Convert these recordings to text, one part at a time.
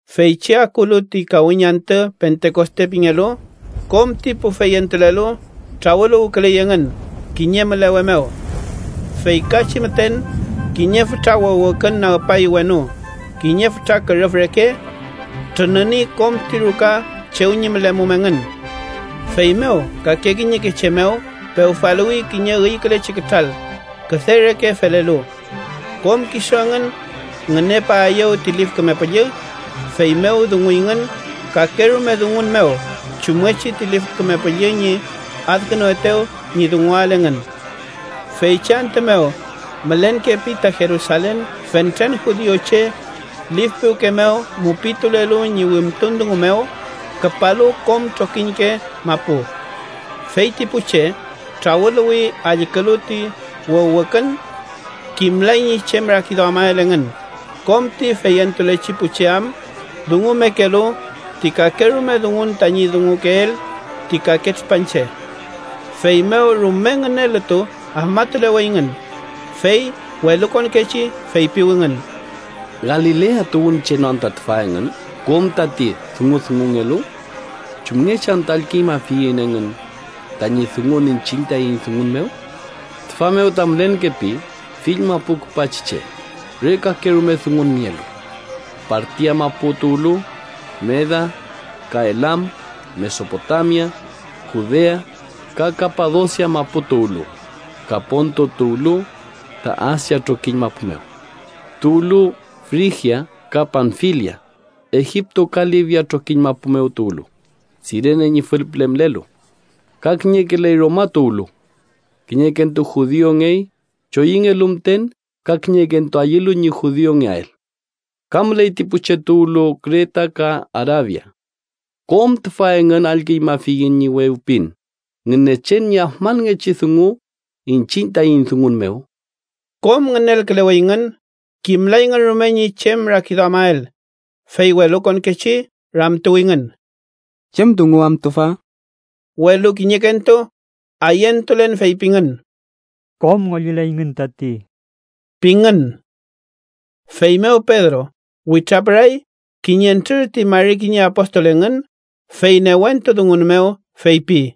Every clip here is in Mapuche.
Feychi akulu ti kawiñ antü Pentekoste pingelu, kom ti pu feyentulelu trawüluwküley engün kiñe mülewe mew. Feykachi müten, kiñe fütra wüwükün nagpay wenu kiñe fütra kürüf reke. Trününi kom ti ruka chew ñi mülemum engün. Feymew kake kiñeke che mew pewfaluwi kiñe üykülechi kütral, küde reke felelu. Kom kisu engün ngünepaeyew ti Lif Küme Püllü, feymew dunguyngün kakerume dungun mew chumngechi ti Lif Küme Püllü ñi adkünuetew ñi dunguael engün. Feychi antü mew mülenkepi ta Jerusalen fentren judiuche lif piwke mew mupitulelu ñi wimtun dungu mew, küpalu kom trokiñke mapu. Fey ti pu che trawüluwi allkülu ti wüwükün. Kimlay ñi chem rakiduamael engün, kom ti feyentulechi pu che am dungumekelu ti kakerume dungun tañi dungukeel ti kake tripanche. Feymew rume ngünelütu afmatuleweyngün, fey welukonkechi feypiwingün: “¿Galilea tuwünche no anta tüfa engün kom tati dungudungungelu? ¿Chumngechi anta allküñmafiyiñ engün tañi dungun iñchiñ taiñ dungun mew? Tüfa mew ta mülenkepi fill mapu küpachi che re kakerume dungun nielu: Partia mapu tuwlu, Meda, ka Elam, Mesopotamia, Judea, ka Kapadosia mapu tuwlu, ka Ponto tuwlu ta Asia trokiñ mapu mew. Tuwlu Frigia ka Panfilia, Egipto ka Libia trokiñ mapu tuwlu, Sirene ñi fülpüle mülelu. Ka kiñekeley Roma tuwlu. Kiñekentu judiungey choyüngelu müten ka kiñekentu ayülu ñi judiungeael. Ka müley ti pu che tuwlu Kreta ka Arabia. ¡Kom tüfa engün allküñmafiyiñ ñi wewpin Ngünechen ñi afmanngechi dungu iñchiñ taiñ dungun mew!” Kom ngünelküleweyngün, kimlayngün rume ñi chem rakiduamael, fey welukonkechi ramtuwingün: “¿Chem dungu am tüfa?” Welu kiñekentu ayentulen feypingün: “¡Kom ngollileyngün tati!” pingün. Feymew Pedro witrapüray kiñentrür ti mari kiñe apostol engün, fey newentu dungun mew feypi: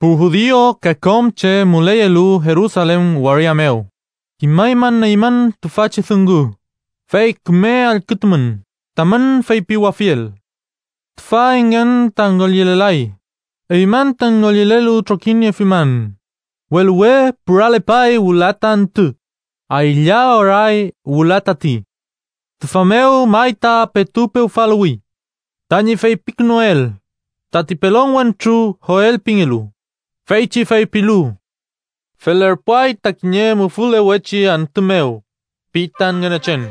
“Pu judiu ka kom che müleyelu Jerusalen waria mew, kimaymün eymün tüfachi dungu, fey küme allkütumün tamün feypiwafiel. Tüfa engün ta ngollilelay. Eymün ta ngollilelu trokiniefimün, welu we püralepay wüla ta antü, aylla oray wüla tati. Tüfa mew may ta petu pewfaluwi tañi feypikünuel tati pelon wentru Joel pingelu, feychi feypilu: ‘Felerpuay ta kiñe mufülewechi antü mew, pi ta Ngünechen,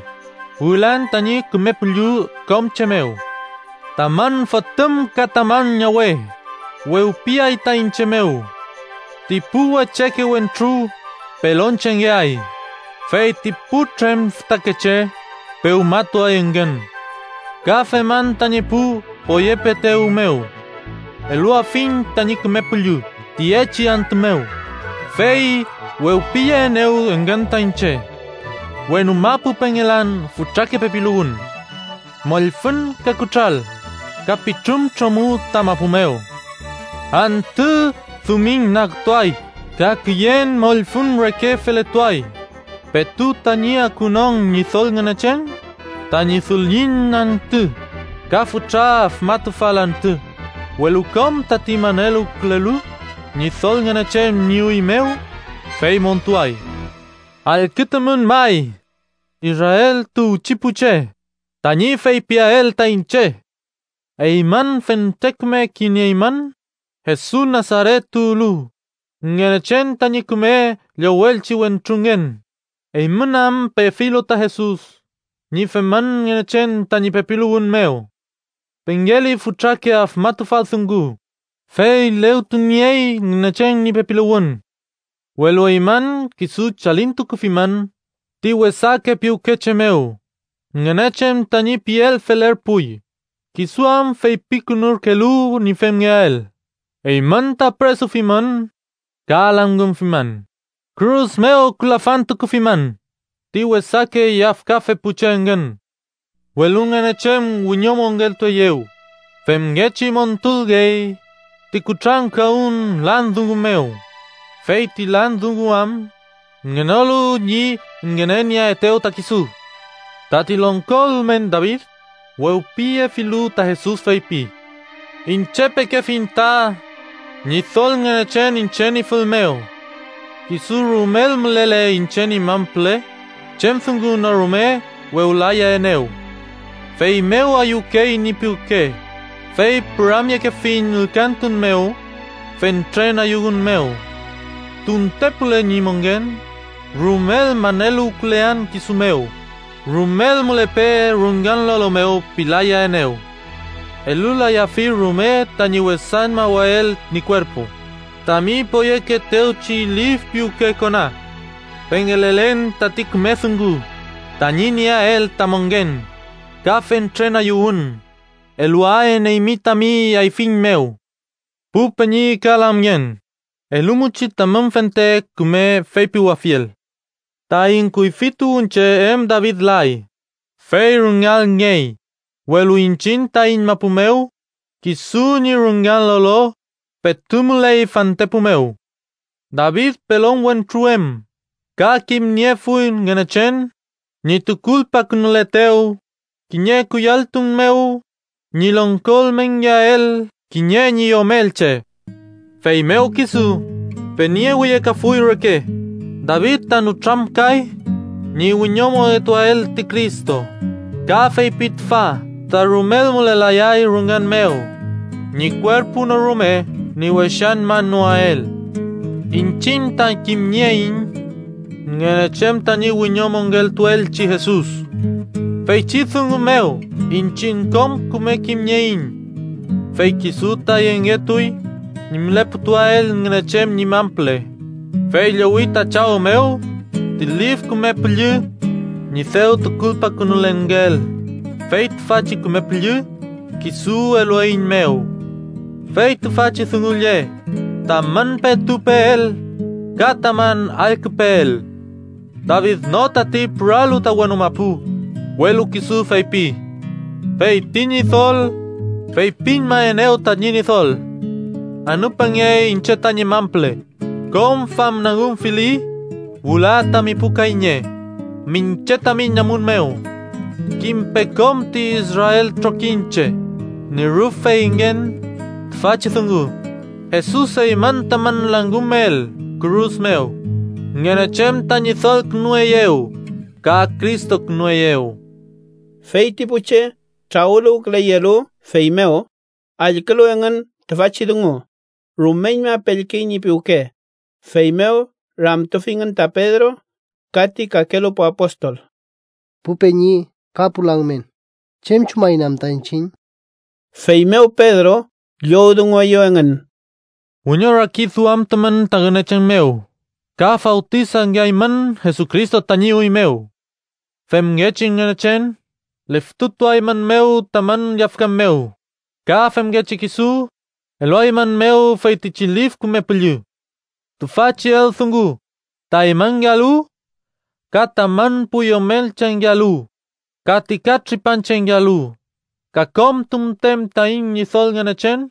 wülan tañi Küme Püllü kom che mew. Tamün fotüm ka tamün ñawe wewpiay ta iñche mew. Ti pu wecheke wentru pelonchengeay, fey ti putrem fütakeche pewmatuay engün. Ka feman tañi pu poyepeetew mew. Eluafiñ tañi Küme Püllü tiyechi antü mew, fey wewpiyeaenew engün ta iñche. Wenu mapu pengelan fütrake pepiluwün, mollfüñ, ka kütral, ka pitrun tromü ta mapu mew. Antü dumiñnagtuay, ka küyen mollfüñ reke feletuay, petu tañi akunon Ñidol Ngünechen tañi dullin antü ka fütra afmatufal antü. Welu kom tati maneluwkülelu Ñidol Ngünechen ñi üy mew, fey montuay.’ “Allkütumün may Israel tuwchi pu che, tañi feypiael ta iñche: Eymün fente küme kimnieymün, Jesus Nasaret tuwlu, Ngünechen tañi küme llowelchi wentrungen, eymün am pefilu ta Jesus ñi femün Ngünechen tañi pepiluwün mew. Pengeli fütrake afmatufal dungu, fey legtuniey Ngünechen ñi pepiluwün. Welu eymün, kisu chalintukufimün ti wesake piwke che mew, Ngünechen tañi piel felerpuy, kisu am feypikünurkelu ñi femngeael, eymün ta püresufimün ka langümfimün, kürus mew külafantufimün ti wesake yafkafe pu che engün. Welu Ngünechen wiñomongeltueyew, femngechi montulngey ti kutrankawün lan dungu mew, fey ti lan dungu am ngenolu ñi ngünenieaetew ta kisu. Tati longko ülmen David, wewpiyefilu ta Jesus, feypi: ‘Iñche pekefiñ ta Ñidol Ngünechen iñche ñi fül mew. Kisu rumel mülele iñche ñi man püle, chem dungu no rume wewlayaenew. Feymew ayüwkey ñi piwke, fey püramyekefiñ ülkantun mew fentren ayüwün mew. Tuntepule ñi mongen, rumel maneluwkülean kisu mew. Rumel mülepe rüngan lolo mew pilayaenew. Elulayafi rume tañi wesañmawael ñi kuerpu tami poyekeetewchi lif piwke kona. Pengelelen tati küme dungu tañi nieael ta mongen, ka fentren ayüwün eluaen eymi tami ayfiñ mew.’ “Pu peñi ka lamngen, elumuchi tamün fente küme feypiwafiel: Taiñ kuyfi tuwünche em David lay, fey rüngalngey, welu iñchiñ taiñ mapu mew kisu ñi rüngan lolo petu müley fantepu mew. David pelon wentru em, ka kimniefuy Ngünechen ñi tukulpakünuletew kiñe kuyalltun mew ñi longko ülmenngeael kiñe ñi yomelche. Feymew kisu peniewiyekafuy reke, David ta nütramkay ñi wiñomongetuael ti Cristo, ka feypi tüfa ta rumel mülelayay rüngan mew, ñi kuerpu no rume ñi wesañmanoael. Iñchiñ ta kimnieiñ Ngünechen tañi wiñomongeltuelchi Jesus. Feychi dungu mew iñchiñ kom küme kimnieiñ. Fey kisu ta yengetuy ñi müleputuael Ngünechen ñi man püle, fey llowi ta Chaw mew ti Lif Küme Püllü ñi dew tukulpakünulelngeel, fey tüfachi Küme Püllü kisu elueiñmew. Fey tüfachi dungu lle tamün petu peel ka tamün allküpeel. David no tati püralu ta wenu mapu, welu kisu feypi: ‘Fey ti Ñidol feypiñmaenew tañi Ñidol: Anüpange iñche tañi man püle, kom famnagümfili wüla tami pu kayñe miñche tami namun mew.’ “Kimpe kom ti Israel trokiñche, ñi rüf feyngen tüfachi dungu: Jesus eymün tamün langümel kürus mew, Ngünechen ta Ñidolkünueyew ka Cristokünueyew.” Fey ti pu che trawüluwküleyelu fey mew, allkülu engün tüfachi dungu, rumeñma pellkey ñi piwke, feymew ramtufingün ta Pedro ka ti kakelu pu apostol: —Pu peñi ka pu lamngen, ¿chem chumaiñ anta iñchiñ? Feymew Pedro llowdungueyew engün: —Wiñorakiduamtumün ta Ngünechen mew ka fawtisangeaymün Jesucristo tañi üy mew. Femngechi Ngünechen liftutuaeymünmew tamün yafkan mew, ka femngechi kisu eluaeymünmew feytichi Lif Küme Püllü. Tüfachi eldungu ta eymünngealu ka tamün pu yomelchengealu ka ti katripanchengealu, ka kom tunten taiñ Ñidol Ngünechen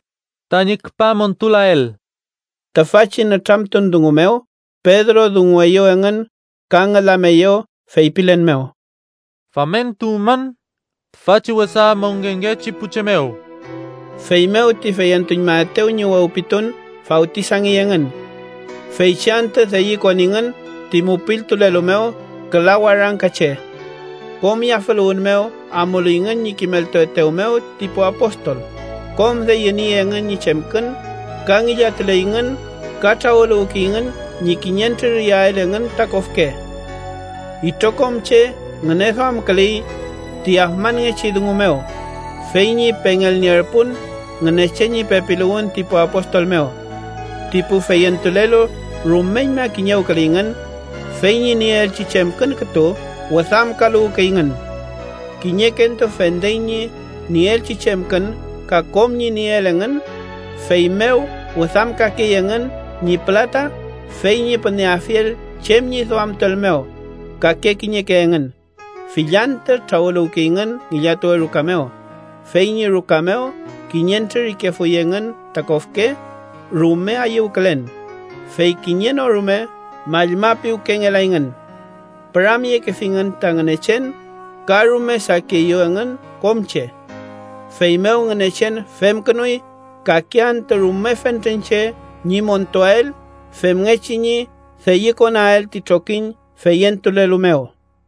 tañi küpa montulael. Tüfachi nütramtun dungu mew Pedro dungueyew engün ka ngülameyew feypilen mew: —¡Famentuwmün tüfachi wesa mongenngechi pu che mew! Feymew ti feyentuñmaetew ñi wewpitun fawtisangey engün. Feychi antü deyükoningün ti mupiltulelu mew küla warangka che. Kom yafüluwün mew amuleyngün ñi kimeltuetew mew ti pu apostol, kom deyüniey engün ñi chemkün, ka ngillatuleyngün ka trawüluwkeyngün ñi kiñentrür iyael engün ta kofke. Itrokom che ngüneduamküley ti afmanngechi dungu mew, fey ñi pengelnierpun Ngünechen ñi pepiluwün ti pu apostol mew. Ti pu feyentulelu rumeñma kiñewküleyngün, fey ñi nieelchi chemkün kütu wüdamkaluwkeyngün. Kiñekentu fendey ñi nieelchi chemkün ka kom ñi nieel engün, feymew wüdamkakey engün ñi pülata fey ñi püneafiel chem ñi duamtuel mew kake kiñeke engün. Fill antü trawüluwkeyngün ngillatuwe ruka mew, fey ñi ruka mew kiñentrür ikefuy engün ta kofke, rume ayüwkülen, fey kiñe no rume mallmapiwkengelayngün. Püramyekefingün ta Ngünechen ka rume sakieyew engün kom che. Feymew Ngünechen femkünuy kake antü rume fentren che ñi montuael femngechi ñi deyükonael ti trokiñ feyentulelu mew.